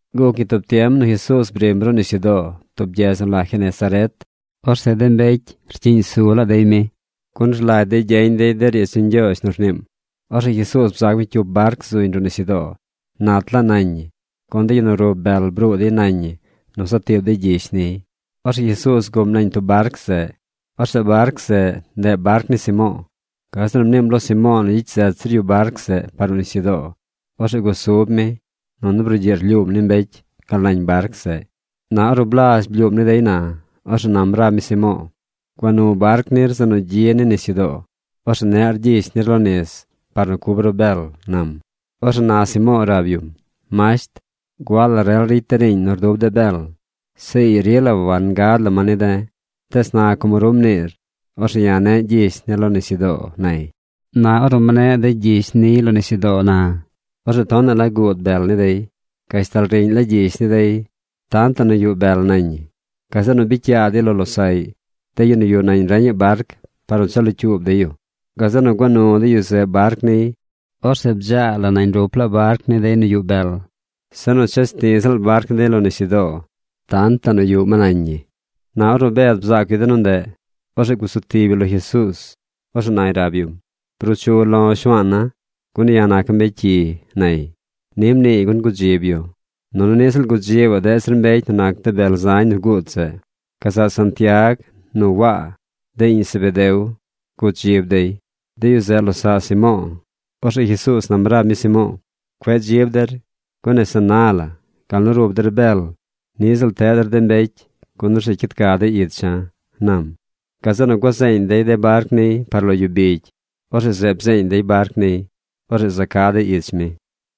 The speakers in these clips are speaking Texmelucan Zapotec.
Guc ñi tub tiem nu Jesuuz brim ruꞌ nisyudoo tub gyedz nu la Genesaret. Orzeꞌ de mbecy rcyiꞌñ su laa dey mi, gun rlagy dey gyeñ dey de riidz ni Ñgyoozh nu rniim. Orzeꞌ Jesuuz bzaac mi cyup barc zuñ ruꞌ nisyudoo. Nat laa nañ ñi, gun de yu nu rub bel bruu dey nañ ñi nu za tiib dey gyish niy. Orzeꞌ Jesuuz guꞌm nañ tub barc zeꞌ. Orzeꞌ barc zeꞌ, ndeꞌ barc ni Simo̱o̱. Gazeꞌ nu mniim lo Simo̱o̱ nu gyicy zet zir yu barc zeꞌ par ruꞌ nisyudoo. Orzeꞌ gusub mi, nunu brugyiꞌ rlyuum ni mbecy gal nañ barc zeꞌ. Na ornu blazh blyuum ni dey na, orzeꞌ nam rab mi Simo̱o̱: ―Gua nu barc nir zeꞌ nu gyi ni nisyudoo. Orzeꞌ neꞌr gyish nir lo nis par nu cub ru bel ―nam. Orzeꞌ na Simo̱o̱ rab yum: ―Masht, gua la rel ricy de̱ riiñ nu rdub de̱ bel. Zeꞌ ii rila wangad la ma ni de̱. Tees na como ru mniir, orzeꞌ ya̱ ne̱ꞌ gyish ne̱ lo nisyudoo ―nay. Na ornu mneꞌ dey gyish niy lo nisyudoo na, orzeꞌ tonaꞌ la guud bel ni dey. Gashtal riꞌñ la gyish ni dey tantaꞌ nu yuꞌ bel nañ ñi. Gazeꞌ nu bicy yaa dey lo losaꞌy, de yu nu yuꞌ nañ reñaꞌ barc par nu cha locyuub dey yu. Gazeꞌ nu gua nu de yu zeꞌ barc niy. Orzeꞌ bdzaa la nañ rup laa barc ni dey nu yuꞌ bel. Se nu ches ti ziꞌl barc ni dey lo nisyudoo tantaꞌ nu yuꞌ ma nañ ñi. Na ornu Bed bzaac yu de nu ndeꞌ, orzeꞌ gusu tib yu lo Jesuuz. Orzeꞌ nay rab yum: ―Bruu chu lo̱ Shuaana̱, gun ya̱ naca̱ mbecy cyi ―nay. Ni mniiy gun gudzib yu, nunu niꞌ ziꞌl gudzibaꞌ deꞌ zir mbecy nu nac de bel zañ nu guud zeꞌ. Gazaꞌ Santiag nu Waa, de iꞌñ Zebedeo, gudzib dey. De yu zeꞌ losaꞌ Simo̱o̱. Orzeꞌ Jesuuz nam rab mi Simo̱o̱: ―Cueꞌ dzib der, gun nese na la gal nu rub der bel, niꞌ ziꞌl teꞌ der de mbecy, gun orzeꞌ cyid ca dey icha̱ ―nam. Gazeꞌ nu gua zeeñ dey de barc niy par lo yu bigy. Orzeꞌ zeꞌ bzeeñ dey barc niy. Orzeꞌ za ca̱ dey ich mi.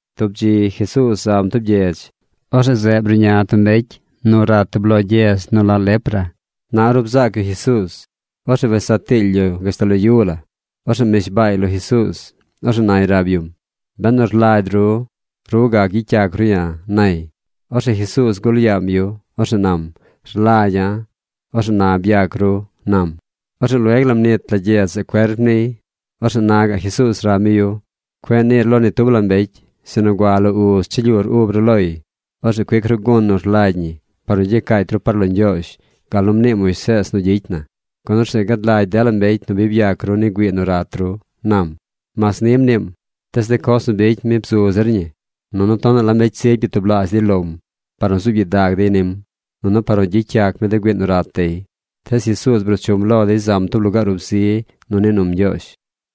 Tub dzi Jesuuz zam tub gyedz. Orzeꞌ zeꞌ bruꞌña tub mbecy nu rat tub lo gyedz nu la lepra. Na ornu bzaac yu Jesuuz, orzeꞌ wes saa tiily yu gashtal lo yu la. Orzeꞌ mnishbaay lo Jesuuz. Orzeꞌ nay rab yum: ―Benu rlagy ru, ru gac gyicy yac ru ya̱ ―nay. Orzeꞌ Jesuuz gul yaam yu. Orzeꞌ nam: ―Rlagya̱. Orzeꞌ na byac ru ―nam. Orzeꞌ lueg la mnit la gyedz zeꞌ cuerp niy. Orzeꞌ na gaꞌ Jesuuz rab mi yu: ―Cueꞌ niir lo ni tub la mbecy, sinu gua lo uz cha lyuur ub ru loy. Orzeꞌ cuic ru gun nu rlagy ñi par nu gyacaacy ru par lo Ñgyoozh gal nu mnii Moisees nu gyicy na, gun orzeꞌ gad lagy dela mbecy nu bi byac ru ni güii nu rat ru ―nam. Mas ni mniim, tees de coz nu bicy mi bzu zir ñi. Nunu tonaꞌ la mbecy zigy byatublaazh dey lom par nu zuub gyidag dey nim, nunu par nu gyicy yac mi de güii nu rat dey. Tees Jesuuz bruu chum lo dey zam tub lugaar ub zi nu nii num Ñgyoozh.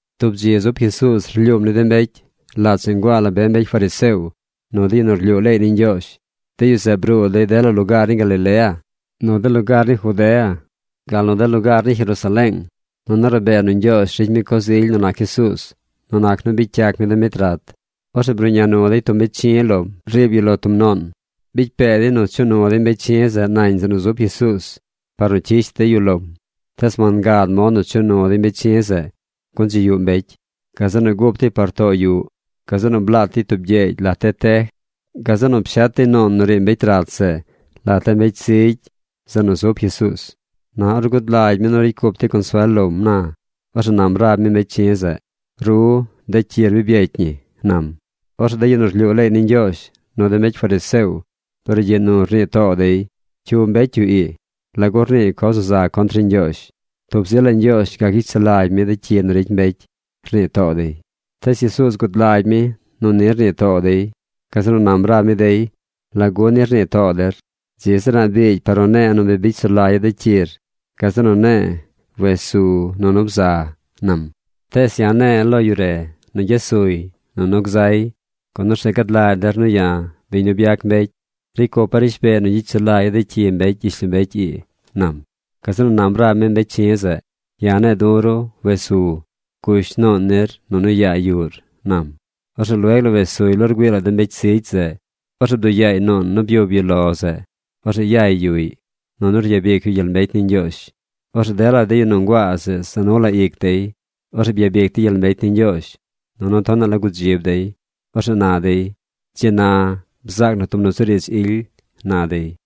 Tub dzi zub Jesuuz rlyuum ni de mbecy. Lat zeꞌ nguaa la be mbecy fariseo nu de yu nu rlyuu leey ni Ñgyoozh. De yu zeꞌ bruu dey dela lugaar ni Galilea, nu de lugaar ni Judea, gal nu de lugaar ni Jerusaleeng. Nunu rabee nu Ñgyoozh ricy mi coz ily nu nac Jesuuz nu nac nu bicy yac mi de mbecy rat. Orzeꞌ bruꞌña nu dey tub mbecy chi̱ lom riib yu lo tub nuun. Bicy pee dey nu chuꞌ nu dey mbecy chi̱ zeꞌ nañ yuꞌ zeꞌ nu zub Jesuuz par nu cyish dey yu lom. Tees wangad mod nu chuꞌ nu dey mbecy chi̱ zeꞌ, gun dzi yuꞌ mbecy. Gazeꞌ nu gup dey par too yuꞌ. Gazeꞌ nu blaat dey tub gyeegy lat de tej. Gazeꞌ nu pshet dey nuun nu riib mbecy rat zeꞌ lat de mbecy zigy zeꞌ nu zub Jesuuz. Na ornu gud lagy mi nu ricy cup dey consuel lom na, orzeꞌ nam rab mi mbecy chi̱ zeꞌ: ―Ru, de cyir bi byecy ñi ―nam. Orzeꞌ de yu nu rlyuu leey ni Ñgyoozh, nu de mbecy fariseo brugyiꞌ nu rnii too dey: “¿Cyu mbecy yu ii? ¿Lagu rniiy coz nu za contr ni Ñgyoozh? Tub zi la Ñgyoozh gac gyicy sulagy mi de cyi nu ricy mbecy”, rnii too dey. Tees Jesuuz gud lagy mi nu ni rnii too dey. Gazeꞌ nu nam rab mi dey: ―¿Lagu ni rnii too der? Dzi zir a̱ꞌ biigy par nu ne̱e̱ nu bi bicy sulagya̱ de cyir gazeꞌ nu ne̱e̱ wes su nunu bza ―nam―. Tees ya̱ ne̱e̱ lo yu re nu gyes suy nunu gzay, gun orzeꞌ gad lagy der nu ya̱, biñ nu byac mbecy, ricy cupa̱ rishbeey nu gyicy sulagya̱ de cyi mbecy gyishlombecy ii ―nam. Gazeꞌ nu nam rab mi mbecy chi̱ zeꞌ: ―Ya̱ ne̱e̱ du̱ ru wes su, gush nuun nir nunu yaa yuꞌr ―nam. Orzeꞌ lueg la wes suy lo rgüii la de mbecy zigy zeꞌ. Orzeꞌ bduꞌ yaay nuun nu byub yu lo zeꞌ. Orzeꞌ yay yuꞌy. Nunu ryabic yu gyel mbecy ni Ñgyoozh. Orzeꞌ dela yu nu nguaa zeꞌ za nu la ic dey. Orzeꞌ byabic dey gyel mbecy ni Ñgyoozh, nunu tonaꞌ la gudzib dey. Orzeꞌ na dey: ―Dzi na bzaac na tub nusuriidz ily ―na dey.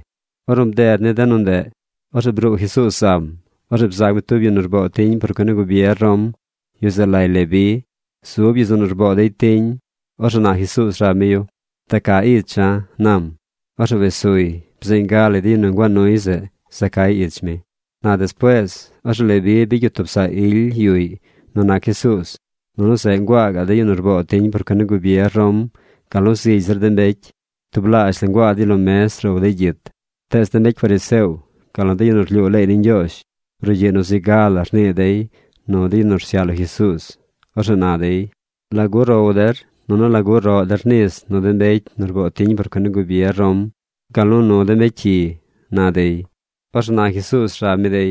Ornu bded ni de nu ndeꞌ, orzeꞌ bruu Jesuuz zam. Orzeꞌ bzaac mi tub yu nu rboo tiñ por cuen ni gubier Rom. Yu zeꞌ lay Leví. Zub yu zeꞌ nu rboo dey tiñ. Orzeꞌ na Jesuuz rab mi yu: ―Da ca icha̱ ―nam. Orzeꞌ wes suy. Bzeeñ ga lay de yu nu nguaa nuy zeꞌ za cay ich mi. Na despuees, orzeꞌ Leví bicy yu tub saꞌ ily yuꞌy nu nac Jesuuz. Nunu zeꞌ nguaa gaꞌ de yu nu rboo tiñ por cuen ni gubier Rom, gal nu zigy zir de mbecy. Tublaazh la nguaa dey lo mez row dey gyit. Tees de mbecy fariseo, gal nu de yu nu rlyuu ley ni Ñgyoozh, brugyiꞌ nu zi ga la rnii dey nu de yu nu rsyaꞌ lo Jesuuz. Orzeꞌ na dey: ―¿Lagu row der, nunu lagu roꞌ der nis nu de mbecy nu rboo tiñ por cuen ni gubier Rom, gal nu nu de mbecy cyi? ―na dey. Orzeꞌ Jesuuz nam rab mi dey: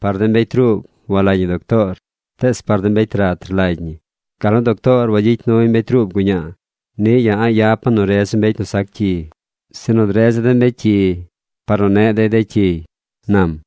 ―Par de mbecy ruub walagy ñi doctoor, tees par de mbecy rat rlagy ñi. Gal nu doctoor wagyicy nuy mbecy ruub guñaa, niꞌ ya̱ a̱ꞌ yapa̱ nu redza̱ mbecy nu sac cyi, sinu dredza̱ de mbecy cyi par nu neꞌ dey de cyiy ―nam.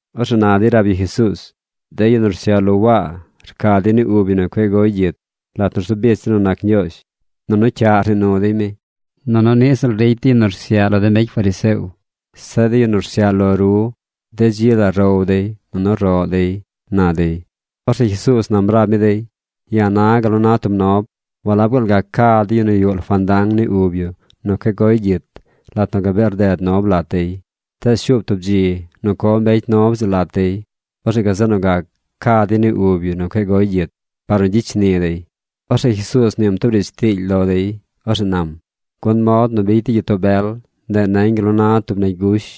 Orzeꞌ na dey rab yu Jesuuz: ―De yu nu rsyaꞌ lo Waa rca dey ni ub yu nu cueꞌ goy gyit lat nu rzu bich dey nu nac Ñgyoozh. Nunu cyaꞌ rnii nu dey mi. Nunu niꞌ ziꞌl ricy de yu nu rsyaꞌ lo de mbecy fariseo. Zeꞌ de yu nu rsyaꞌ lo ru de dzi la row dey nunu roꞌ dey ―na dey. Orzeꞌ Jesuuz nam rab mi dey: ―Ya̱ na̱ gal nu na tub nob. ¿Walab gaal gac ca de yu nu yuꞌ lo fandang ni ub yu nu cueꞌ goy gyit lat nu gabee rded nob lat dey? Tees shuub tub dzi nu co mbecy nob zeꞌ lat dey. Orzeꞌ gazeꞌ nu gac ca dey ni ub yu nu cueꞌ goy gyit par nu gyicy shni dey. Orzeꞌ Jesuuz mniim tub riidz tiily lo dey. Orzeꞌ nam: ―Gun mod nu bicy de gyitoo bel, ndeꞌ nañ gal nu na tub negy gush.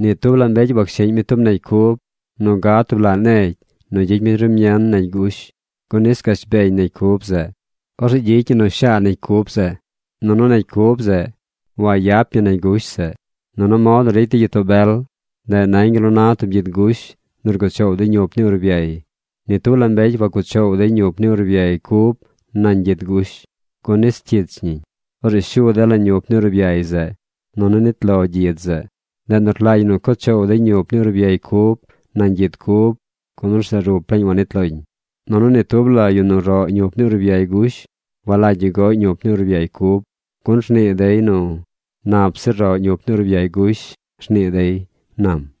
Ni tub la mbecy washiꞌñ mi tub negy cub nu gad tub laꞌ negy nu gyicy mi rumien negy gush, gun nis gash beñ negy cub zeꞌ. Orzeꞌ gyicy ñi nu shaa negy cub zeꞌ. Nunu negy cub zeꞌ wagyap ñi negy gush zeꞌ. Nunu mod nu ricy de gyitoo bel, ndeꞌ nañ gal nu na tub gyid gush nu rguꞌ choow dey ñup ni urbyay. Ni tub la mbecy wac cuꞌ choow dey ñup ni urbyay cub nañ gyid gush, gun nis cyich ñiñ. Orzeꞌ shu dela ñup ni urbyay zeꞌ, nunu nit lo gyid zeꞌ. Ndeꞌ nu rlagy ñi cuꞌ choow dey ñup ni urbyay cub nañ gyid cub, gun orzeꞌ rup laañ wanit lom. Nunu ni tub la yu nu roꞌ ñup ni urbyay gush walagy yu goꞌy ñup ni urbyay cub, gun rnii dey nu “Nap zir roꞌ ñup ni urbyay gush”, rnii dey ―nam.